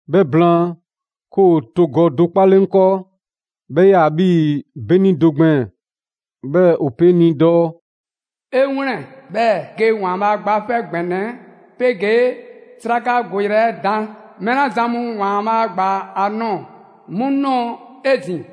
'Bhɛ blaan, 'ke ‑o togɔ do 'kpale 'ŋ 'kɔɔ; 'bhɛ 'yaa‑ 'bhii‑ 'beni do gbɛɛn‑. 'Bhɛɛ‑ ‑o pe 'ŋ ni dɔɔ: «'E 'wlɛn‑, 'bhɛɛ‑ ge ‑Waanbhaa' Gba 'Fɛ ‑Gbɛnɛ 'ɛ 'pegee 'srakagoyrɛ 'ɛ dan. Mɛɛ 'la zan mu ‑Waanbhaa' gba a nɔɔ‑ 'mu nɔɔ 'ezin‑.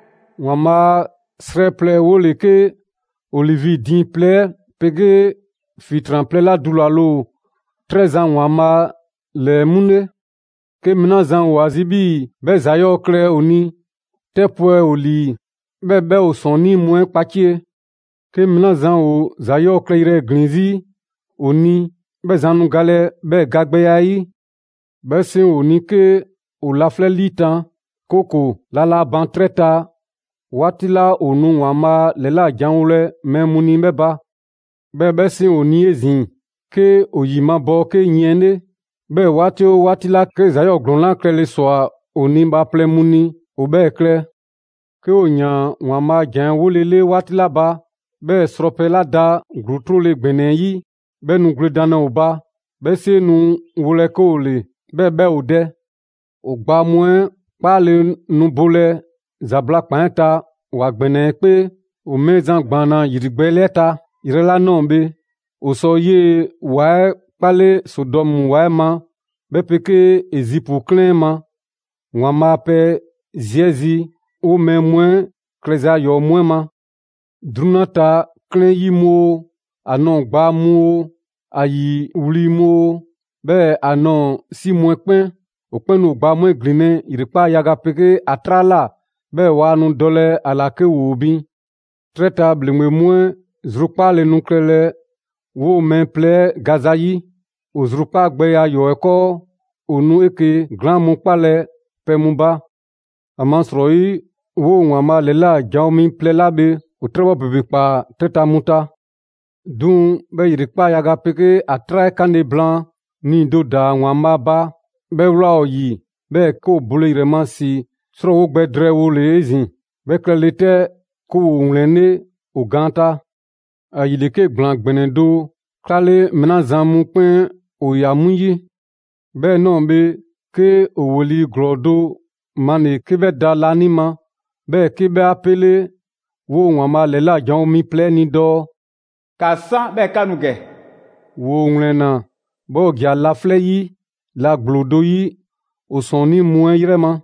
‑Waanbhaa' 'srɛ plɛ 'ɛ 'wole‑ 'ke olivi diiŋ plɛ 'pegee ‑fitran plɛ 'la dulale ‑o 'trɛ Zan ‑Waanbhaa' ‑lɛɛ 'mu 'le. 'Ke mɛɛ 'la zan ‑o ‑a zi' 'bhii‑ 'bhɛ ‑za 'yɔɔ‑ klɛ ‑o ni, 'tɛ 'pwɛ ‑o ‑lii, 'bhɛɛ‑ 'bhɛ ‑o ‑sɔɔnnii' mu 'ɛ kpacie. 'Ke mɛɛ 'la zan ‑o ‑za 'yɔɔ‑ klɛyrɛ ‑glin 'zi ‑o ni, 'bhɛ zan nu galɛ 'bhɛɛ‑ gagbɛya 'ɛ 'yi. 'Bhɛ 'seŋ ‑o ni 'ke ‑o laflɛ' 'liitan‑, 'kooko‑ la laa ban 'trɛ ta 'waati 'la ‑o nu ‑Waanbhaa' ‑lɛlajanwolɛ mɛɛ mu ni 'bhɛ ba. 'Bhɛɛ‑ 'bhɛ 'seŋ ‑o ni 'ezin‑ 'ke ‑o ‑yi mabɔɔ 'ke yiɛn 'le. 'Bhɛɛ‑ 'waati oo 'waati 'la 'ke ‑za 'yɔɔ‑ ‑glɔɔn 'la klɛle ‑swa ‑o ni bhaaplɛŋ mu ni, ‑o bhɛɛ‑ klɛ. 'Ke ‑o ‑yaan ‑Waanbhaa' a ‑jan 'ɛ 'wolele 'waati 'la ba, 'bhɛɛ‑ srɔpɛ 'la da ‑gluu 'trole‑ ‑gbɛnɛ 'ɛ 'yi, 'bhɛ nu gwledanlɛ ‑o ba. 'Bhɛ 'seŋ nu wolɛ 'ke ‑o ‑le, 'bhɛɛ‑ 'bhɛ ‑o dɛ. ‑O gbaa mu 'ɛ 'kpaale‑ nu bolɛ ‑zabla' ‑kpan 'ɛ ta ‑wa ‑gbɛnɛ 'ɛ 'kpee, ‑o Mɛɛzan ‑gbaanna ‑yrigbɛɛle 'ɛ ta yrɛ 'la ꞊nɔɔ bhe. ‑O sɔ 'yee‑ ‑wa 'ɛ 'kpale Sodɔmu ‑wa 'ɛ ma 'bhɛ 'pegee Ezipu 'klɛɛn 'ɛ ma ‑Waanbhaa' a pɛ zi 'ɛ zi, 'woo‑ mɛɛ mu 'ɛ klɛza ‑yɔɔ' mu 'ɛ ma. 'Drunyan ta 'klɛɛn 'yi mu oo, ‑a nɔɔ‑ ‑gbaa mu oo, ‑a ‑yi wli mu oo, 'bhɛɛ‑ ‑a nɔɔ‑ 'si mu 'ɛ 'kpɛn. ‑O 'kpɛn nu ‑o gbaa mu 'ɛ ‑glinlɛ' ‑yrekpaa' yaga 'pegee ‑a 'traa ꞊la; 'bhɛɛ‑ waa nu dɔlɛ ‑a ‑la 'ke ‑woo bin. 'Trɛ ta bhaaplɛŋ mu 'ɛ zrukpaale nu klɛlɛ 'woo‑ mɛɛ plɛ 'ɛ gaza 'yi. ‑O zrukpaagbɛya ‑yɔɔ' 'ɛ 'kɔɔ, ‑o nu 'eke‑ glaan mu 'kpalɛ‑ pɛ mu ba. ‑Amasrɔyi 'woo‑ ‑Waanbhaa' ‑lɛla' janwo mi plɛ 'la bhe ‑o 'trɛbhɔ ‑bebe ‑kpaa 'trɛ ta mu ta. 'Duŋ‑ 'bhɛ ‑yrekpaa' yaga 'pegee ‑a 'traa 'ɛ 'kanle‑ blaan, nii‑ do ‑daa ‑Waanbhaa' ba, 'bhɛ ꞊wlaa ‑o ‑yi, 'bhɛɛ‑ 'ke ‑o bole ‑yrɛ ma ‑si 'srɔɔwo gbɛ drɛɛwole 'ezin‑. 'Bhɛ klɛle 'tɛ, 'ke ‑woo ‑wlɛnlɛ' ‑o gaan ta. ‑Ayile, 'ke ‑gblaan ‑gbɛnɛ do 'klale mɛɛ 'la zan mu 'kpɛn ‑o ꞊ya 'mu 'yi. 'Bhɛ ꞊nɔɔ bhe, 'ke ‑o ‑weli' ‑glɔɔ do male‑ 'ke 'bhɛ da laanima, 'bhɛɛ‑ 'ke 'bhɛ 'a 'pele 'woo‑ ‑Waanbhaa' ‑lɛla' janwo mi plɛ 'ɛ ni dɔɔ: «‑Ka 'san, 'bhɛɛ‑ ‑ka nu ‑gɛ!» ‑Woo ‑wlɛnna, 'bhɛɛ‑ ‑o ‑ja laflɛ' 'yi la ‑gblo do 'yi, ‑o ‑sɔɔnnii' mu 'ɛ 'yrɛ ma.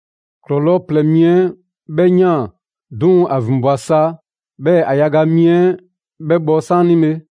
‑Klɔlɔɔ' plɛ mi 'ɛ 'bhɛ ꞊yaan; 'duŋ‑ ‑a ‑vinbwa sa 'bhɛɛ‑ ‑a yaga mi 'ɛ 'bhɛ bhɔ 'saanibhe.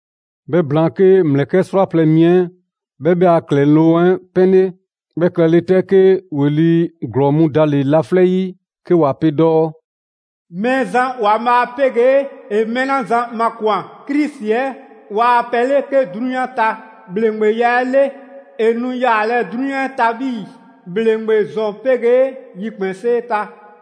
'Bhɛ blaan, 'ke ‑mlɛkɛ' 'srwaplɛ‑ mi 'ɛ 'bhɛ 'bhɛ a ‑klɛloŋ' 'ɛ 'pɛnle. 'Bhɛ klɛle 'tɛ, 'ke ‑weli' ‑glɔɔ mu dale‑ laflɛ' 'yi 'ke ‑wa pe dɔɔ: «Mɛɛzan ‑Waanbhaa' 'pegee ‑e mɛɛ 'la zan makwan‑, Krisi 'ɛ, ‑waa pɛ ‑le 'ke 'drunyan ta ‑bhleŋgbeya 'ɛ 'le. ‑E nu yaalɛ 'drunyan 'ɛ ta 'bhii‑ ‑bhleŋgbe ‑zɔn 'pegee yikpɛnsee ta!»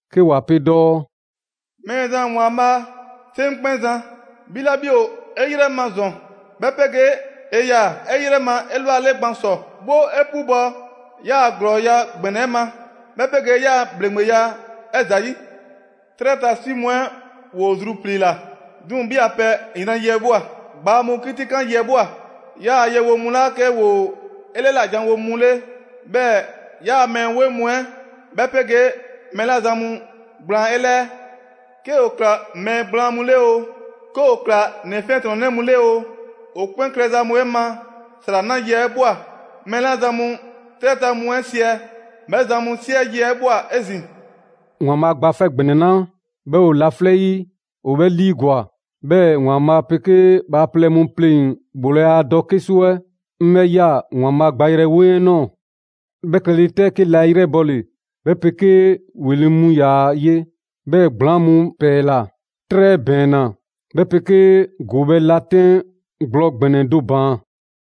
'Ke ‑wa pe dɔɔ: «Mɛɛzan ‑Waanbhaa', 'Seŋkpɛnzan, 'bhi 'la 'bhi ‑o 'e 'yrɛ ma ‑zɔn, 'bhɛ 'pegee 'e 'yaa‑ 'e 'yrɛ ma 'elwale gban ‑sɔ. 'Woo 'e 'pubɔ‑ 'yaa‑ ‑glɔɔya' ‑gbɛnɛ 'ɛ ma, 'bhɛ 'pegee 'yaa‑ ‑bhleŋgbeya 'ɛ ‑zayi'. 'Trɛ ta 'si mu 'ɛ ‑woo zrupliila, 'duŋ‑ 'bhi a pɛ yran yi 'ɛ ꞊bhwa. Gbaa mu 'kitikan yi 'ɛ ꞊bhwa. 'Yaa‑ yewonɛ mu 'la 'ke ‑woo 'e 'lɛla‑ ‑janwo' mu 'le, 'bhɛɛ‑ 'yaa‑ mɛɛ 'weŋ mu 'ɛ, 'bhɛ 'pegee mɛɛ 'la zan mu gblaan 'e 'lɛɛ; 'ke ‑o ‑kla mɛɛ gblaan mu 'le oo, 'ke ‑o ‑kla ‑nɛ 'fiɛntrɔnnɛ mu 'le oo, ‑o 'kpɛn klɛza mu 'ɛ ma ‑sra 'na yi 'ɛ ꞊bhwa. Mɛɛ 'la zan mu 'trɛ ta mu 'ɛ siɛ, 'bhɛ zan mu 'siɛ yi 'ɛ ꞊bhwa 'ezin‑.» ‑Waanbhaa' Gba 'Fɛ ‑Gbɛnɛ 'la 'bhɛ ‑o laflɛ' 'yi ‑o 'bhɛ 'liigwa‑. 'Bhɛɛ‑ ‑Waanbhaa' 'pegee bhaaplɛŋ mu pleŋ‑ ‑bhoolaya dɔ 'kesu 'ɛ 'ŋ 'bhɛ ꞊ya ‑Waanbhaa' gbayrɛ 'weŋ 'ɛ ꞊nɔɔ. 'Bhɛ klɛle 'tɛ, 'ke la 'e 'yrɛbɔle, 'bhɛ 'pegee ‑weli' mu ‑yaa ye, 'bhɛɛ‑ ‑gblaŋ' mu 'pɛɛla‑; 'trɛ ‑bɛɛnna, 'bhɛ 'pegee ‑goobhɛ' la 'tɛn gblɔ ‑gbɛnɛ do ‑baan.